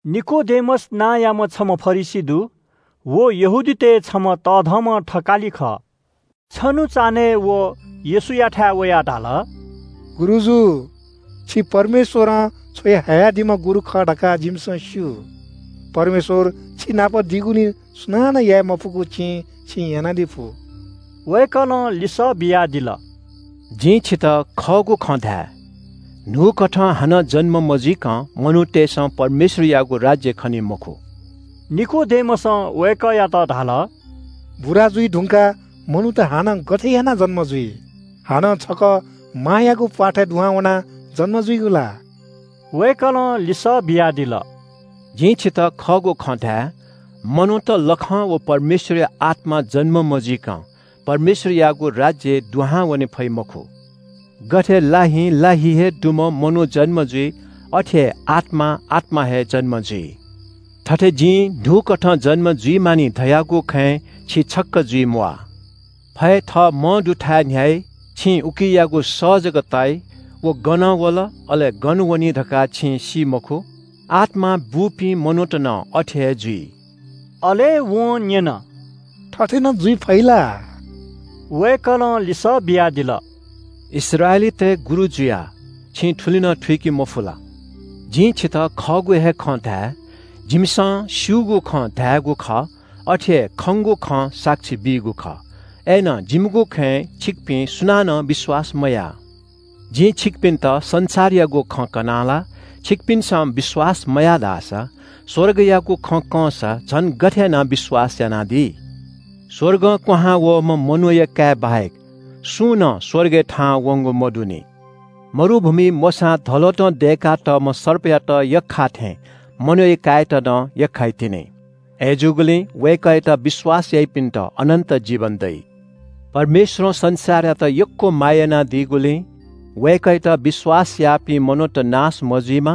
निकोदेमस नांयाम्‍ह छम्‍ह फरिसी दु। व यहूदीतय् छम्‍ह तःधंम्‍ह थकालि खः। छन्‍हु चान्‍हय् व येशूयाथाय् वयाः धाल – “गुरुजु, छि परमेश्‍वरं छ्वयाहयादीम्‍ह गुरु खः धकाः जिमिसं स्‍यू। परमेश्‍वर छिनाप दीगुलिं सुनानं याये मफुगु चिं छिं यानादी फु।” वय्‌कलं लिसः बियादिल – “जिं छितः खःगु खँ धाये – न्‍हूकथं हानं जन्‍म मजुइकं मनूतय्‌सं परमेश्‍वरयागु राज्‍य खनी मखु।” निकोदेमसं वय्‌कःयात धाल – “बुरा जुइ धुंकाः मनूत हानं गथे यानाः जन्‍म जुइ? हानं छकः मांयागु प्‍वाथय् दुहां वनाः जन्‍म जुइगु ला?” वय्‌कलं लिसः बियादिल – “जिं छितः खःगु खँ धाये, मनूत लखं व परमेश्‍वरया आत्‍मां जन्‍म मजुइकं परमेश्‍वरयागु राज्‍यय् दुहां वने फइ मखु। गथे लाहिं ला हि हे दुम्‍ह मनू जन्‍म जुइ, अथे हे आत्‍मां आत्‍मा हे जन्‍म जुइ। थथे जिं न्‍हूकथं जन्‍म जुइ मानि धयागु खँय् छि छक्‍क जुइम्‍वाः। फय् थः मंदुथाय् न्‍ह्याइ, छिं उकियागु सः जक ताइ, व गनं वल, अले गन वनी धकाः छिं सी मखु। आत्‍मां बूपिं मनूत नं अथे हे जुइ।” अले वं न्‍यन – “थथे नं जुइ फइ ला?” वय्‌कलं लिसः बियादिल – “इस्राएलीतय् गुरु जुयाः छिं थुलि नं थुइके मफु ला? जिं छितः खःगु हे खँ धाये – जिमिसं स्‍यूगु खँ धायेगु खः, अथे हे खंगु खँ साक्षी बीगु खः। अय्‌नं जिमिगु खँय् छिकपिं सुनानं विश्‍वास मयाः। जिं छिकपिन्‍त संसारयागु खँ कनाः ला छिकपिन्‍सं विश्‍वास मयाः धाःसा स्‍वर्गयागु खँ कंसा झन गथे यानाः विश्‍वास यानादी? स्‍वर्गं क्‍वहां वःम्‍ह मनूया काय् बाहेक सुं नं स्‍वर्गय् थाहां वंगु मदुनि। मरुभूमिइ मोशां धलोतं दय्‌का तःम्‍ह सर्पयात यख्‍खाःथें मनूया काय्‌यात नं यख्‍खाइतिनि। अथे जूगुलिं वय्‌कःयात विश्‍वास याइपिन्‍त अनन्‍त जीवन दइ।” “परमेश्‍वरं संसारयात यक्‍व माया यानादीगुलिं वय्‌कःयात विश्‍वास याःपिं मनूत नाश मजुइमा,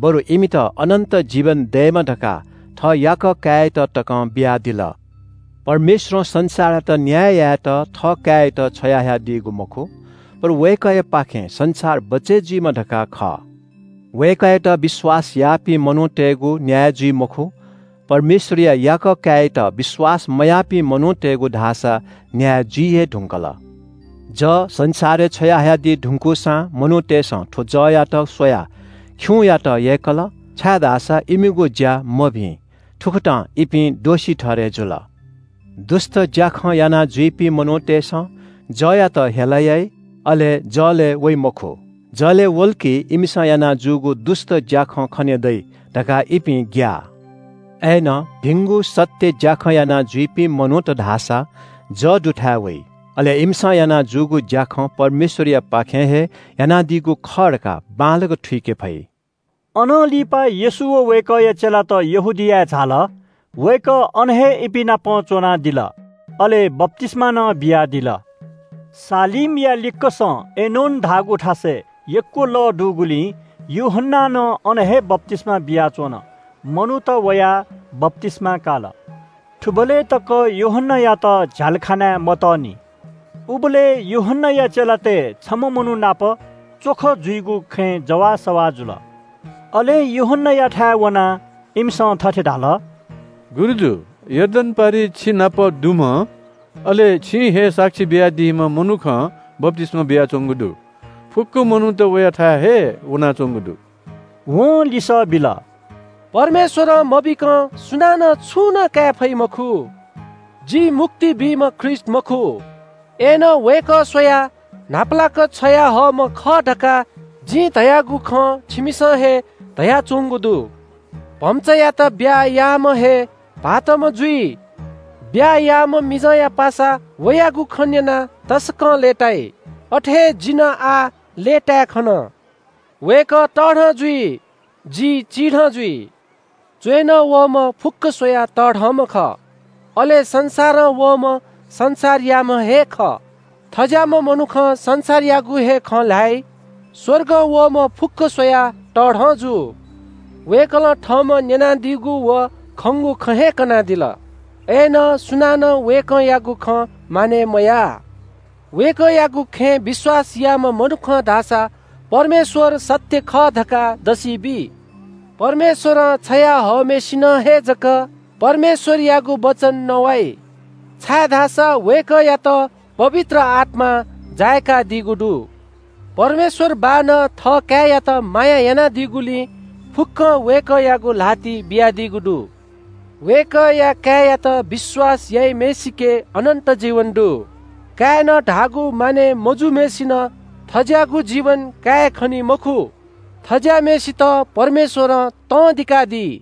बरु इमित अनन्‍त जीवन दयेमा धकाः थः याकः काय्‌यात तकं बियादिल। परमेश्‍वरं संसारयात न्‍याय यायेत थःकाय्‌यात छ्वयाहयादीगु मखु, बरु वय्‌कःयापाखें संसार बचय् जुइमा धकाः खः। “वय्‌कःयात विश्‍वास याःपिं मनूतय्‌गु न्‍याय जुइ मखु, परमेश्‍वरया याकः काय्‌यात विश्‍वास मयाःपिं मनूतय्‌गु धाःसा न्‍याय जुइ हे धुंकल। जः संसारय् छ्वयाहयादी धुंकूसां मनूतय्‌सं थ्‍व जःयात स्‍वयाः खिउँयात यय्‌कल, छाय्‌धाःसा इमिगु ज्‍या मभिं। थुकथं इपिं दोषी ठहरय् जुल। दुष्‍ट ज्‍याखँ यानाजुइपिं मनूतय्‌सं जःयात हेला याइ, अले जलय् वइ मखु। जलय् वल कि इमिसं याना जूगु दुष्‍ट ज्‍याखँ खने दइ धकाः इपिं ग्‍याः। अय्‌नं भिंगु सत्‍य ज्‍याखँ यानाजुइपिं मनूत धाःसा जः दुथाय् वइ। अले इमिसं याना जूगु ज्‍याखँ परमेश्‍वरयापाखें हे यानादीगु खः धकाः बांलाक थुइके फइ।” अनं लिपा येशू व वय्‌कःया चेलात यहूदियाय् झाल। वय्‌कः अन हे इपिं नाप च्‍वनादिल, अले बप्‍तिस्‍मा नं बियादिल। सालीमया लिक्‍कसं एनोन धाःगु थासय् यक्‍व लः दुगुलिं यूहन्‍नां नं अन हे बप्‍तिस्‍मा बियाच्‍वन। मनूत वयाः बप्‍तिस्‍मा काल। थुबलय् तक यूहन्‍नायात झ्‍यालखानाय् मतःनि। उबलय् यूहन्‍नाया चेलातय् छम्‍ह मनू नाप च्‍वख जुइगु खँय् जवाःसवाः जुल। अले यूहन्‍नायाथाय् वनाः इमिसं थथे धाल – “गुरुजु, यर्दन पारिइ छिनाप दुम्‍ह, अले छिं हे साक्षी बियादीम्‍ह मनुखं बप्‍तिस्‍मा बियाच्‍वंगु दु। फुक्‍क मनूत वयाथाय् हे वनाच्‍वंगु दु।” वं लिसः बिल – “परमेश्‍वरं मबीकं सुनानं छुं नं काये फइ मखु। जि मुक्ति बीम्‍ह ख्रीष्‍ट मखु, अय्‌नं वय्‌कः स्‍वयाः न्‍हापालाक छ्वयाहःम्‍ह खः धकाः जिं धयागु खँ छिमिसं हे धयाच्‍वंगु दु। भम्‍चायात ब्‍याहा याःम्‍ह हे भाःतम्‍ह जुइ। ब्‍याहा याःम्‍ह मिजंया पासा वयागु खँ न्‍यनाः तसकं लय्‌ताइ। अथे हे जि नं आः लय्‌ताय् खन। वय्‌कः तःधं जुइ, जि चिधं जुइ।” “च्‍वय्‌नं वःम्‍ह फुक्‍क स्‍वयाः तःधंम्‍ह खः। अले संसारं वःम्‍ह संसारयाम्‍ह हे खः, थज्‍याःम्‍ह मनुखं संसारयागु हे खँ ल्‍हाइ। स्‍वर्गं वःम्‍ह फुक्‍क स्‍वयाः तःधं जू। वय्‌कलं थःम्‍हं न्‍यनादीगु व खंगु खँ हे कनादिल, अय्‌नं सुनानं वय्‌कःयागु खँ मानय् मयाः। वय्‌कःयागु खँय् विश्‍वास याःम्‍ह मनुखं धाःसा परमेश्‍वर सत्‍य खः धकाः दसि बी। परमेश्‍वरं छ्वया हःम्‍हय्‌सिनं हे जक परमेश्‍वरयागु वचन नवाइ, छाय्‌धाःसा वय्‌कःयात पवित्र आत्‍मां जाय्‌कादीगु दु। परमेश्‍वर बाःनं थःकाय्‌यात माया यानादीगुलिं फुक्‍कं वय्‌कःयागु ल्‍हातिइ बियादीगु दु। वय्‌कःया काय्‌यात विश्‍वास याइम्‍हय्‌सिके अनन्‍त जीवन दु। काय्‌नं धाःगु मानय् मजूम्‍हय्‌सिनं थज्‍याःगु जीवन कायेखनी मखु, थज्‍याःम्‍हय्‌सित परमेश्‍वरं तं दिकादी।”